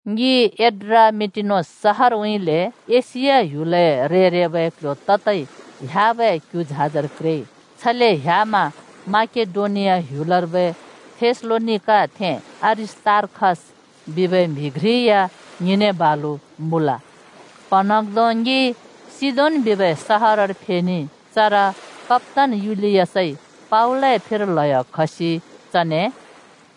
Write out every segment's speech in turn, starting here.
ङि एड्रामिटेनोस सहरउँइँले एशिया ह्‍युलए रे-रेबै क्ल्ह्‍यो ततै ह्‍याबै क्यु झाजर क्रेइ। छले ह्‍यामा माकेडोनिया ह्‍युलर्बै थेसलोनिकाथें अरिस्‍तार्खस बिबै म्हि घ्रि या ङिने बालु मुँल। प्‍हँन्हाँग्धों ङि सिदोन बिबै सहरर फेनेइ। चर कप्‍तान युलियसइ पावलए फिर ल्हयो खसि चने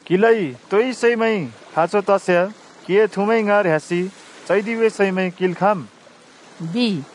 “क्हिलाइ तोइ सैमैं खाँचो तस्याँ क्हिए थुमैं ङाँर ह्‍यासि चैदिबै सैमैं किंल् खाँम्,” बिइ।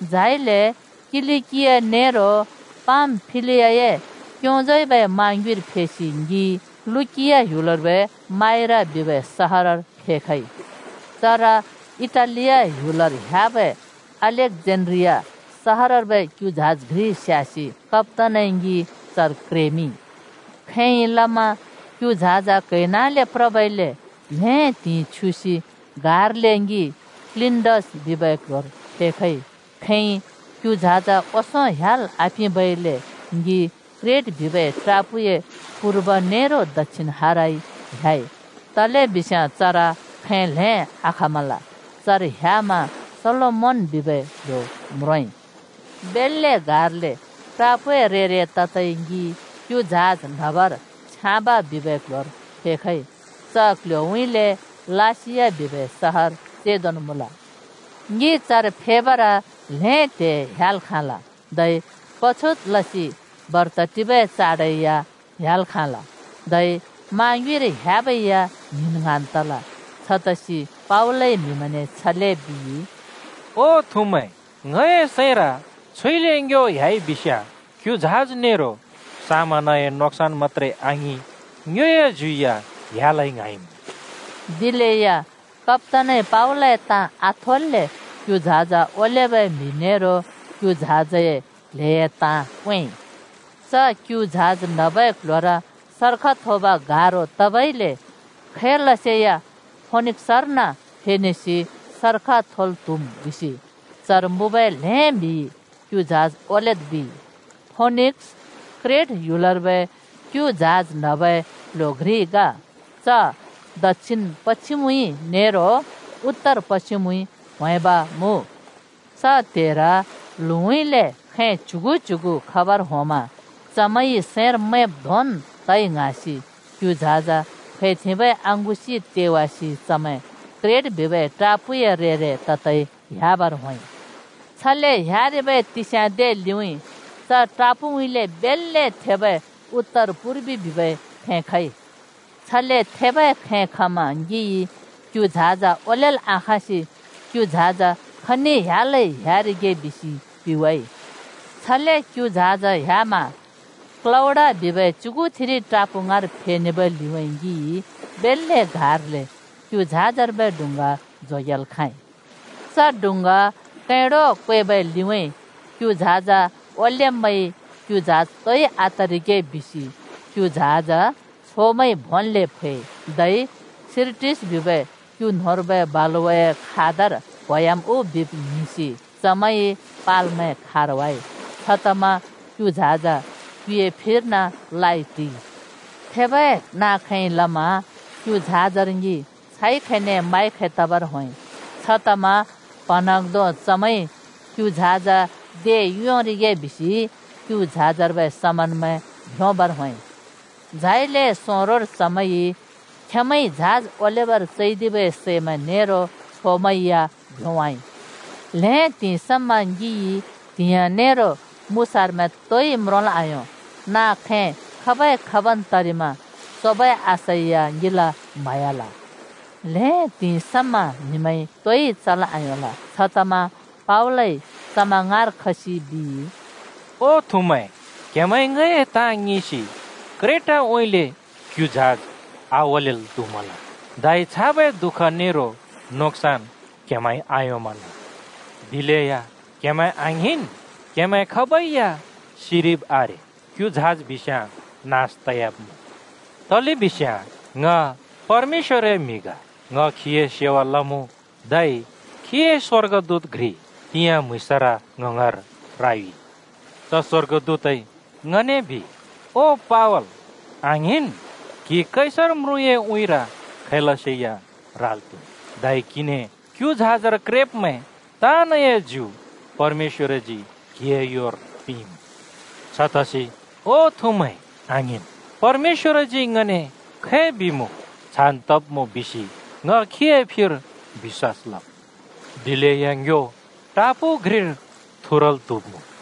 झाइले किलिकिया नेरो पामफिलियाए क्योंजउँइँबै मा ङ्युँइर फेसि ङि लुकिया ह्‍युलर्बै माइरा बिबै सहरर फेखइ। चर इटालिया ह्‍युलर ह्‍याबै अलेक्‍जेन्ड्रिया सहरर्बै क्यु झाज घ्रि स्यासि कप्‍तानइ ङि चर क्रेमिंइ। खैंइ लमा क्यु झाज क्हैनाँले प्रबइले ल्हें त्हिंइ छ्युसि गार्ले ङि क्‍निडस बिबै क्ल्ह्‍योर फेखइ। खैंइ क्यु झाज ओंसों ह्‍याल् आपिंबइले ङि क्रेट बिबै टापूए पूर्व नेरो दक्षिण हारउँइँ ह्‍याइ, तलेबिस्‍याँ चर खैं ल्‍हें आचल्‍दिमल। चर ह्यामा सालोमोन बिबै क्‍ल्‍हो म्रोंइ। बेल्‍ले गार्ले टापूए रे-रे ततै ङि “क्यु झाज न्हबर छ्याँब” बिबै क्ल्ह्‍योर फेखइ। च क्ल्ह्‍योउँइँले लासिया बिबै सहर चेंदोन् मुँल। ङि चर फेबर ल्हें त्हे ह्‍याल् खाँल, धै पछुत लसि बर्त टिबै चाड या ह्‍‍याल् खाँल। धै मा ङ्युँइर ह्‍याबै या ङ्हिंन् ङ्हाँन् तल। छतसि पावलइ म्हिमैंने छले बिइ, “ओ थुमैं, ङए सैंर छुइले ङ्यो ह्‍याइ बिस्याँ क्यु झाज नेरो समनए नोक्सन् मत्‍त्रे आङिं, ङ्योए ज्यु या ह्‍यालै ङ्हाँइमुँ।” दिलेया कप्‍तानइ पावलए ताँ आथेल्‍ले क्यु झाज ओलेबै म्हि नेरो क्यु झाजए क्ल्हेए ताँ क्वेंइ। च क्यु झाज न्हबै क्ल्ह्‍योर सर्ख थोब गारो तबइले खैलसे या फोनिक्‍सर्न फेनेसि सर्ख थोल् त्हुम् बिसि चर मुँबै ल्हें म्हिइ क्यु झाज ओलेद् बिइ। फोनिक्‍स क्रेट ह्‍युलर्बै क्यु झाज न्हबै क्ल्ह्‍यो घ्रि ग, च ल्हुउँइँ न्हुउँइँ (दक्षिण-पश्चिमउँइँ) नेरो ताइ न्हुउँइँ (उतर-पश्चिमउँइँ) ह्‍वेंब मुँ। च त्हेर ल्हुँउँइँले (दक्षिणउँइँले) खैं च्युगु च्युगु खबर होंमा चमैंइ सैंर मैंब् धोंन् तइ ङ्हाँसि क्यु झाज फैथेंबै अँगुसि तेवासि चमैं क्रेट बिबै टापूए रे-रे ततै ह्‍याबर होंइ। छले ह्‍यारिबै तिस्या दे लिउँइँ च टापू पट्टिउँइँले बेल्‍ले थेबै उत्तर-पूर्व बिबै खैं खइ। छले थेबै खैं खमा ङिइ क्यु झाज ओलेल् आखाँसि क्यु झाज खनि ह्‍यालै ह्‍यारिगे बिसि पिवाइ। छले क्यु झाज ह्‍यामा क्‍लौडा बिबै च्युथिरि टापू ङाँर फेनेबै लिउँइँ ङिइ बेल्‍ले गार्ले क्यु झाजर्बै डुँङ्गा जोगेल् खाँइ। च डुङ्गा कैंडो क्वेबै लिउँइँ क्यु झाज ओलेब्मैंइ क्यु झाज तोइ आतरिगे बिसि क्यु झाज छोमैंइ भोंन्ले फैइ। धै सिरटिस् बिबै क्यु न्होंर्बै बालुवाए खादर क्होयाम् उ बिब् ङ्हिंसि चमैंइ पालमैं खारवाइ। छतमा क्यु झाज क्युए फिर्न ल्हाइ टिइ। थेबै नाँ-खैंइ लमा क्यु झाजर ङि छाइ खैने माइ खै तबर होंइ, छतमा प्हँन्हाँग्धों चमैंइ क्यु झाज योंरिगे बिसि क्यु झाजर्बै समनमैं भ्योंबर होंइ। झाइले सोंरोर चमैंइ खेंमैंए योइन झाज ओलेबर चैदिबै सैमैं नेरो छोमैं या भ्योंवाइ। ल्‍हें त्हिंइ समा ङिइ त्हिंया नेरो मुसारामैं तोइ म्रोंल् आयों। नाँ-खैं खबै-खब् तरिमा सोबै आशा या ङिला म्हयाल। ल्हें त्हिंइ समा म्हिमैंइ तोइ चल् आयोंल। छतमा पावलइ चमैं ङाँर खसि बिइ, “ओ थुमैं, क्हेमैंइ ङए ताँ ङिंसि क्रेटउँइँले क्यु झाज आओलेल् त्हुमल, धै छाबै दुःख नेरो नोक्सान् क्हमैंइ आयोंमल। दिलेया क्हेमैं आङ्हिंन्। क्हेमैं खाबै या सिरिब् आरे, क्यु झाज बिस्याँ नास तयाब्मुँ। तलेबिस्याँ ङ परमेश्‍वरए म्हि ग, ङ खीए सेवा लमुँ, धै खीए स्वर्गदूत घ्रि तिंयाँ म्हुँइँसर ङ ङाँर रायुइ। च स्वर्गदूतइ ङने बिइ, ‘ओ पावल, आङ्हिंन्! क्हि कैसर म्रुँए उँइँर खैलसे या राल् त्हुम्। धै क्हिने क्यु झाजर क्रेब्मैं ताँनए ज्यु परमेश्‍वरजी क्हिए योर पिंइमुँ।’ छतसि, ओ थुमैं, आङ्हिंन्! परमेश्‍वरजी ङने खै बिइमुँ, छान् तब्मुँ बिसि ङ खीए फिर बिश्‍वास लम्। दिलेया ङ्यो टापू घ्रिर थुरल् त्हुब्मुँ।”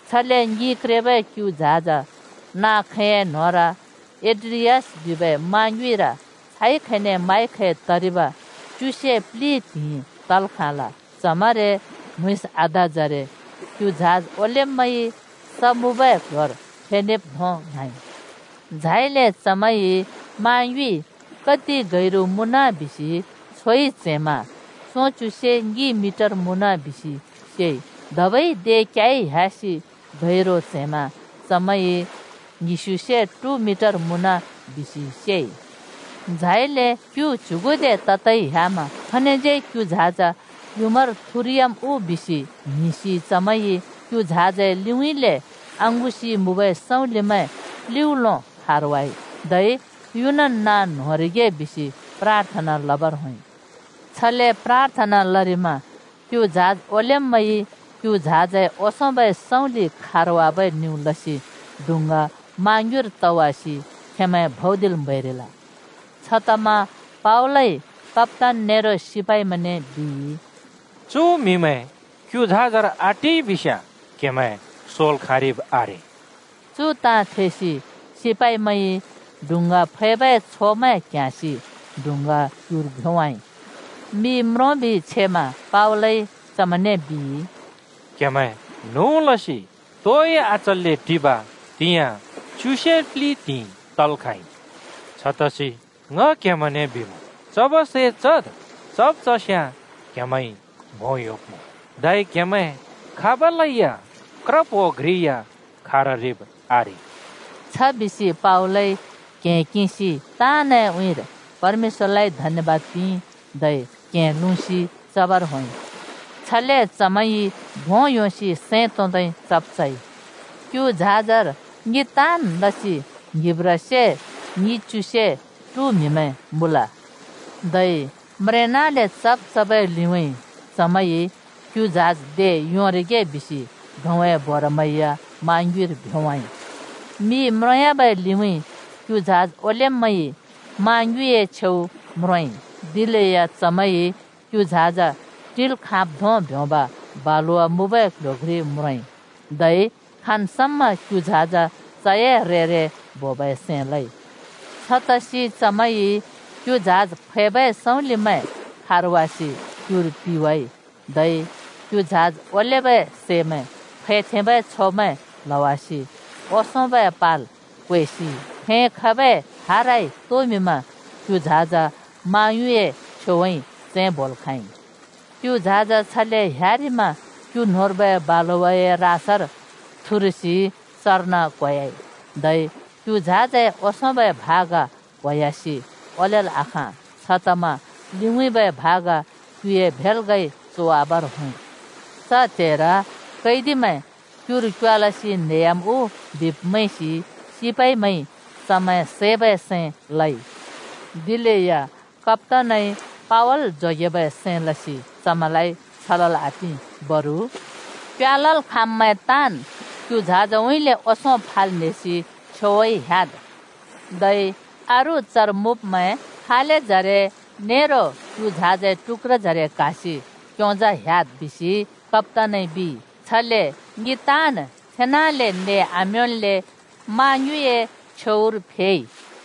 छले ङि क्रेबै क्यु झाज नाँ-खैंए न्होंर एड्रियास बिबै मा ङ्युँर छाइ खैने माइ खै तरिब च्युसे प्लि त्हिंइ तल् खाँल। च्हमरे म्‍हुँइँस आ‍धाजरे क्यु झाज ओलेब्मैंइ स मुँबै क्ल्ह्‍योर फेखब्धों ङ्हाँइ। झाइले चमैंइ मा ङ्युँइ कति गैरु मुँन बिसि छोइ च्हैंमा सोंच्यु से ङि मिटर मुँन बिसि सेइ, धबै दे क्याइ ह्‍यासि गैरु च्हैमा चमैंइ ङ्हिस्युसे ट्हु मिटर मुँन बिसि सेइ। झाइले क्यु च्युगुदे ततै ह्‍यामा खनिज्यै क्यु झाज युँमार थुरयाम् उ बिसि ङ्हिंसि चमैंइ क्यु झाजए लिउँइँले अँगुसि मुँबै सँउँलिमैं प्लिउँलो खारवाइ, धै युनन् नाँ न्होंरिगे बिसि प्राथना लबर होंइ। छले प्राथना लरिमा क्यु झाज ओलेब्मैंइ क्यु झाजए ओंसोंबै सँउँलि खारबै निउ लसि डुँङ्गा मा ङ्युँइर तवासि खेंमैं भौदिल् म्हैरिल। छतमा पावलइ कप्‍तान नेरो सिपाइमैंने बिइ, “चु म्हिमैं क्यु झाजर आटिइ बिस्याँ क्हेमैं सोल् खाँरिब् आरे।” चु ताँ थेसि सिपाइमैंइ डुँङ्गा फैबै छोमैं क्ह्‍याँसि डुँङ्गा क्युर भ्योंवाइ। मि म्रोंबि छेमा पावलइ चमैंने बिइ, “क्हेमैं न्हुँ लसि तोइ आचल्‍ले टिब तिंयाँ च्युसे प्लि त्हिंइ तल् खाँइ। छतसि ङ क्हेमैंने बिमुँ, चबै सै चद्। चब् चस्याँ क्हेमैंइ भों योंब्मुँ, धै क्हेमैं खाबलै या क्रप्हो घ्रि या खाररिब् आरे।” छबिसि पावलइ क्हें किंसि ताँनए उँइँर परमेश्‍वरलाइ धन्यबाद पिंइ, धै क्हें लुँसि चबर होंइ। चमैं सैं भोंल् योंसि सैं तोंदै चब् चइ। (क्यु झाजर ङि ताँन् लसि ङ्हिंब्ब्रासे ङिच्युसे ट्हु म्हिमैं मुँल।) धै म्रेंनाले चब् चबै लिउँइँ, चमैंइ क्यु झाज योंरिगे बिसि गहुँए बोरामैं मा ङ्युँइर भ्योंवाइ। मि म्रोंयाबै लिउँइँ क्यु झाज ओलेब्मैंइ माँ ङ्युँइँए छेउ म्रोंइ, दिलेया खनर फेखइ बिब आसे। दिलेया चमैंइ क्यु झाज टिल् खाँब् धों ब्योंब बलुवा मुँबै क्ल्ह्‍यो घ्रि म्रोंइ। धै खाँन् समा क्यु झाज चए रेर बोबै सैं लइ। छतसि चमैंइ क्यु झाज फैबै सँउँलिमैं खारवासि क्युर पिवाइ। धै क्यु झाज ओलेबै सैमैं फैथेंबै छोमैं प्ल्हवासि ओंसोंबै पाल क्वेसि खैं खबै हाराइ तोमिंमा क्यु झाज माँ ङ्युँइँए छेउउँइँ चैं बोइ। क्यु झाज छले ह्‍यारिमा क्यु न्होंर्बै बालुवाए रासर थुरसि चर्न क्होयाइ, धै क्यु झाजए ओंसोंबै भाग क्होयासि ओलेल् आखाँ। छतमा लिउँइँबै भाग क्युए भेल्गइ चोवाबर होंइ। च त्हेर कैदिमैं क्युर क्योवालसि न्हेह्‍याम् उ बिब् मैंसि सिपाइमैंइ चमैं सैबै सैं लइ। दिलेया कप्‍तानइ पावल जोगेबै सैं लसि चमैंलाइ छ लल् आपिं। बरु “क्योवालल् खाँम्मैं ताँन् क्यु झाजउँइँले ओंसों फाल् न्हेसि छेउउँइँ त्होंन्। धै अरू चर मुँब्मैं फालेजरे नेरो क्यु झाजए टुक्‍क्रजरे क्हासि क्योंजा ह्‍याद्,” कप्‍तानइ बिइ। छले ङि ताँन् छेनाले नें आम्योंल्‍ले मा ङ्युँइए छेउर फेइ।